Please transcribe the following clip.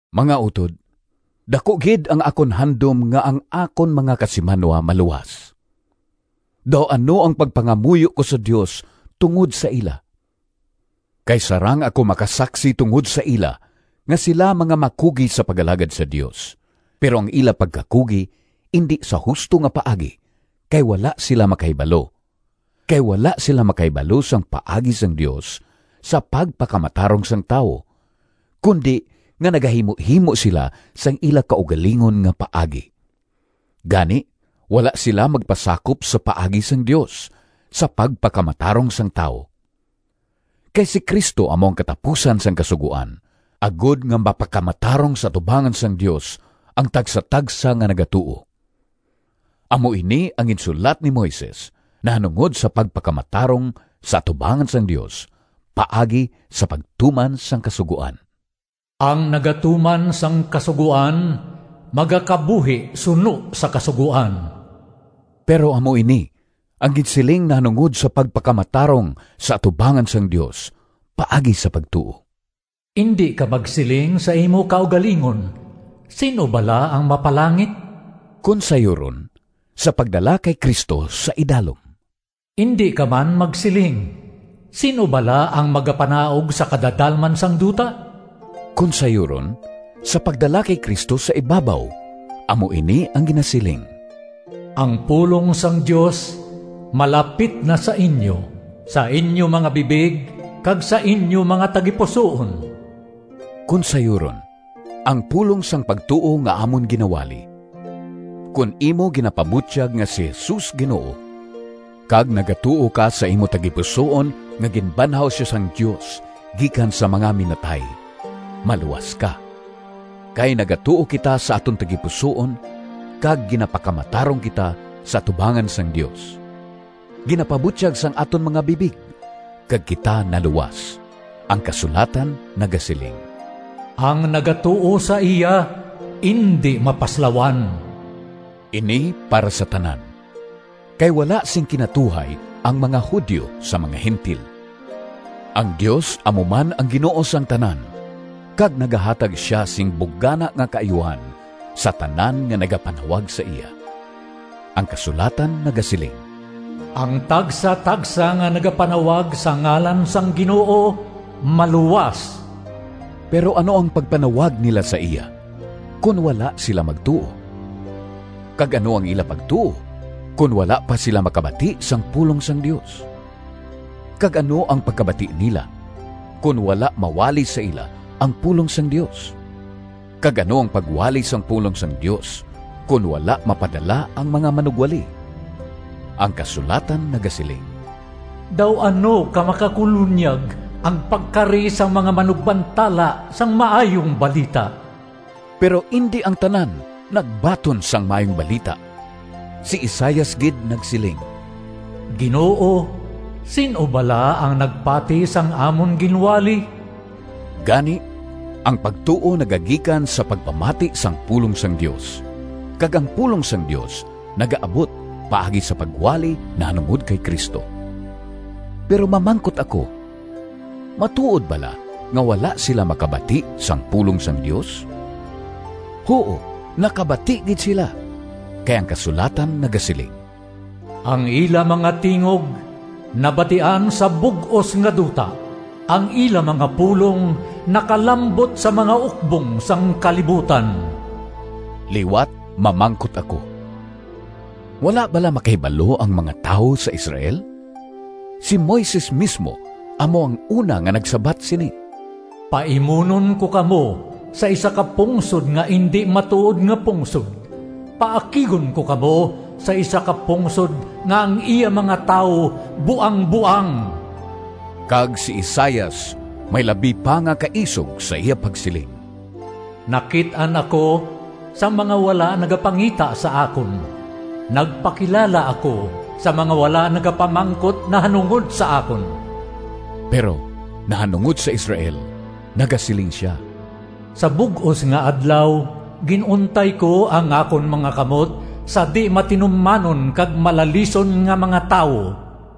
Mga utod, daku gid ang akon handom nga ang akon mga kasimanwa maluwas! Daw ano ang pagpangamuyo ko sa Dios tungod sa ila! Kay sarang ako makasaksi tungod sa ila nga sila mga makugi sa pag-alagad sa Dios, pero ang ila pagkakugi indi sa husto nga paagi kay wala sila makahibalo. Kay wala sila makahibalo sang paagi sang Dios sa pagpakamatarong sang tawo, kundi nga nagahimuhimo sila sang ila kaugalingon nga paagi. Gani, wala sila magpasakop sa paagi sang Dios sa pagpakamatarong sang tawo. Kay si Cristo amo ang katapusan sang Kasugoan, agod nga mapakamatarong sa atubangan sang Dios ang tagsatagsa nga nagatuo. Amo ini ang ginsulat ni Moises nahanungod sa pagpakamatarong sa atubangan sang Dios paagi sa pagtuman sang Kasugoan, “Ang nagatuman sang Kasugoan magakabuhi suno sa kasugoan.” Pero amo ini ang ginsiling nahanungod sa pagpakamatarong sa atubangan sang Dios paagi sa pagtuo, “Indi ka magsiling sa imo kaugalingon, Sin-o bala ang mapalangit?” (kon sayuron, sa pagdala kay Cristo sa idalom). “Indi ka man magsiling, Sin-o bala ang magapanaog sa kadadalman sang duta?” (kon sayuron, sa pagdala kay Cristo sa ibabaw). Amo ini ang ginasiling: “Ang pulong sang Dios malapit na sa inyo, sa inyo mga bibig kag sa inyo mga tagipusoon”—kon sayuron, ang pulong sang pagtuo nga amon ginawali. Kon imo ginapabutyag nga “si Jesus Ginoo,” kag nagatuo ka sa imo tagipusoon nga ginbanhaw sia sang Dios gikan sa mga minatay, maluwas ka. Kay nagatuo kita sa aton tagipusoon kag ginapakamatarong kita sa atubangan sang Dios. Ginapabutyag sang aton mga bibig, kag kita naluwas. Ang kasulatan nagasiling, “Ang nagatuo sa iya indi mapaslawan.” Ini para sa tanan, kay wala sing kinatuhay ang mga Judio sa mga Gentil. Ang Dios amo man ang Ginoo sang tanan, kag nagahatag sia sing bugana nga kaayuhan sa tanan nga nagapanawag sa iya. Ang kasulatan nagasiling, “Ang tagsatagsa nga nagapanawag sa ngalan sang Ginoo maluwas.” Pero ano ang pagpanawag nila sa iya, kon wala sila magtuo? Kag ano ang ila pagtuo, kon wala pa sila makabati sang pulong sang Dios? Kag ano ang pagkabati nila, kon wala mawali sa ila ang pulong sang Dios? Kag ano ang pagwali sang pulong sang Dios, kon wala mapadala ang mga manugwali? Ang kasulatan nagasiling, “Daw ano ka makakulonyag ang pagkari sang mga manugbantala sang maayong balita!” Pero indi ang tanan nagbaton sang Maayong Balita! Si Isaias gid nagsiling, “Ginoo, sin-o bala ang nagpati sang amon ginwali?” Gani, ang pagtuo nagagikan sa pagpamati sang pulong sang Dios, kag ang pulong sang Dios nagaabot paagi sa pagwali nahanungod kay Cristo. Pero mamangkot ako, matuod bala nga wala sila makabati sang pulong sang Dios? Huo, nakabati gid sila! Kay ang kasulatan nagasiling: “Ang ila mga tingog Nabatian sa bug-os nga duta, Ang ila mga pulong Nakalambot sa mga ukbong Sang kalibutan.” Liwat mamangkot ako: Wala bala makahibalo ang mga tawo sa Israel? Si Moises mismo amo ang una nga nagsabat sini: “Paimunon ko kamo sa isa ka pungsod Nga indi matuod nga pungsod; Paakigon ko kamo sa isa ka pungsod Nga ang iya mga tawo buangboang.” Kag si Isaias may labi pa nga kaisog sa iya pagsiling: “Nakit-an ako Sang mga wala nagapangita sa akon, Nagpakilala ako Sa mga wala nagapamangkot Nahanungod sa akon.” Pero nahanungod sa Israel nagasiling sia, “Sa bug-os nga adlaw, gin-untay ko ang akon mga kamot sa dimatinumanon kag malalison nga mga tawo.”